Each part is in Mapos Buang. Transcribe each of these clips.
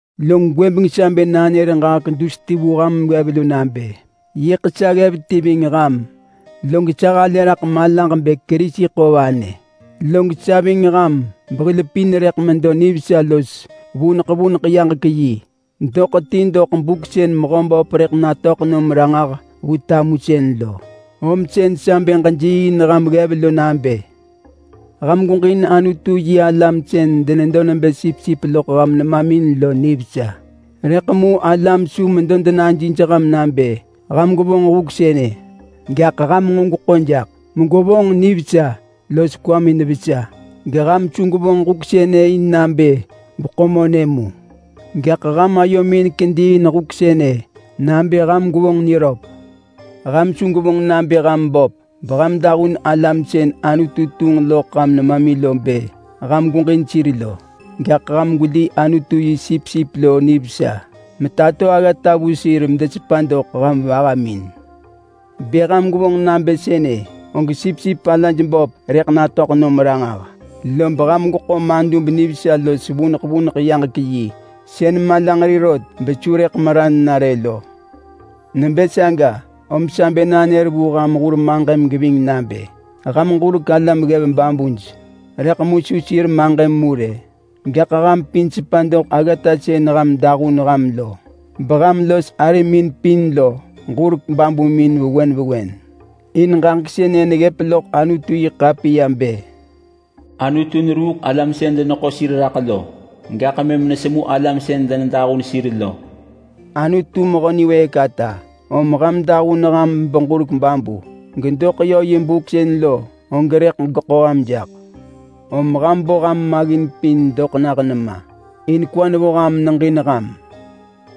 Log gwëbeng sa bë nanër ġaġek dus ti vu ham ggev lo nabë: Yiḳ sa ggev ti ving ham, log sa halë raḳ malaġ bë Kerisi ḳo vanë. Log sa ving ham behil pin rëḳ medo nivesa los vuneḳ vuneḳ yaġek yi doḳ ti doḳ buk sën Mehöböp rëḳ natöḳ nom ranġah vu tamusën lo. Om sën sa bë ġejiiin ham ggev lo nabë: Ham gweġin Anutu-yi-alam sën denedo nebë sipsip loḳ ham nemamin lo nivesa. Rëḳ mu alam su medo denajij ham nabë ham gwevonġ huk sënë, gaḳ ham nġo gweḳo jaḳ megwevonġ nivesa los kwamin vesa. Geham su gwevonġ huk sënë in nabë gweḳo monë mu, gaḳ ham ayomin kedi in huk sënë nabë ham gwevonġ niröp. Ham su gwevonġ nabë ham böp beham dahun alam sën Anutu tunġ loḳ ham nemamin bë ham gweġin sir lo. Gaḳ ham gweli Anutu yi sipsip lo nivesa metato aggata vu sir medesepa doḳ ham vahamin. Bë ham gwevonġ nabë sënë, og sipsip alaj böp rëḳ natöḳ nom ranġah, lob ham gweḳo madub nivesa los vuneḳ vuneḳ yaġek-yi sën malanġeri rot besu rëk meran na rë lo. Nebë saga, om sa bë nanër vu ham hur maġëm geving nabë: Ham ġurek alam ggev babuj. Rëḳ mu su sir maġëm mu rë, gaḳ ham pin sepa doḳ aggata sën ham dahun ham lo, beham los arimin pin lo ġurek babumin vewen vewen. In ġaġek sënë neggëp loḳ Anutu-yi-ḳapiya bë: “Anutu neruuk alam sën deneḳo sir raḳ lo, gaḳ mëm nesemu alam sën denedahun sir lo.” Anutu mehö niwëëk ata, om ham dahun ham beġurek babu, gedoḳ yö yi buk sën lo, og rëḳ geḳo ham jaḳ. Om ham bo ham maggin pin doḳ nah nema, in kwa nevo ham meneġin ham.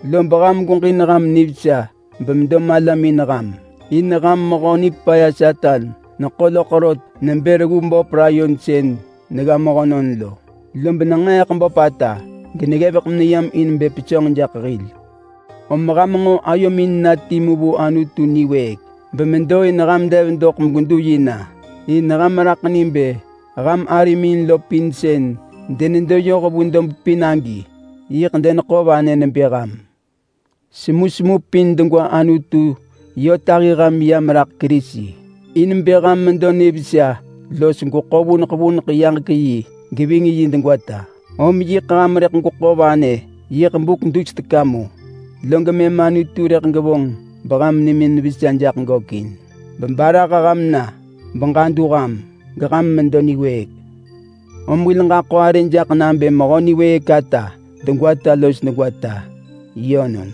Lob ham gweġin ham nivesa bemedo malamin ham. In ham mehö nipaya Satan neḳo loḳ rot nebë reggu böp layon sën negga mehönon lo, lob nenġeeḳ böpata geneggevek meneyam in bë pesönġ jaḳ hil. Om ham nġo ayomin na timu vu Anutu niwëëk bemedo in ham dev doḳ megwedu yi na. In ham neraḳ ni bë ham arimin lo pin sën denedo yoh vu dob pin agi yiḳ deneḳo vanë nebë ham. Semusemu pin degwa Anutu yö tahi ham yam raḳ Kerisi, in bë ham medo nivesa los gweḳo vuneḳ vuneḳ yaġek-yi geving yi degwata. Om yiḳ ham rëḳ gweḳo vanë yiḳ buk dus teka mu, log mëm Anutu rëḳ gevonġ beham nimin vesa jaḳ gökin, bebarah ham na, beġadu ham, geham medo niwëëk. Om hil ġaḳo arë jaḳ nabë Mehö niwëëk ata degwata los degwata. Yönon.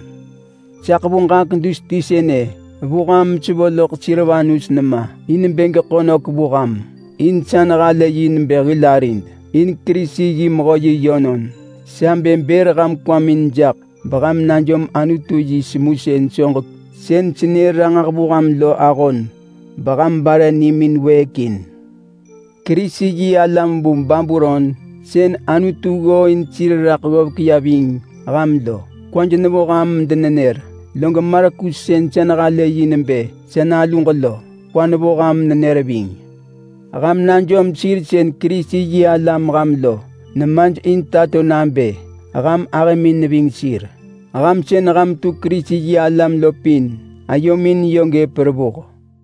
Sa ḳevu ġaġek dus ti sënë vu ham mesevo loḳ Silvanus nema in bë geḳo nök vu ham. In sa nehalë yi nebë hil arid, in Kerisi yi mehö yi yönon. Sa bë bër ham kwamin jaḳ beham najom Anutu yi semusën soġek sën senër ranġah vu ham lo ahon beham bare nimin wëëk in. Kerisi-yi-alam vu Babulon sën Anutu ggooin sir raḳ ggovek ya ving ham lo kwaj nevo ham medenenër. Log Markus sën vonġ bë sa naluġ lo kwa nevo ham menenër ving. Ham najom sir sën Kerisi-yi-alam ham lo nemaj in tato nabë ham ahëmin neving sir. Ham sën ham tu Kerisi-yi-alam lo pin ayomin yö gëp revuh.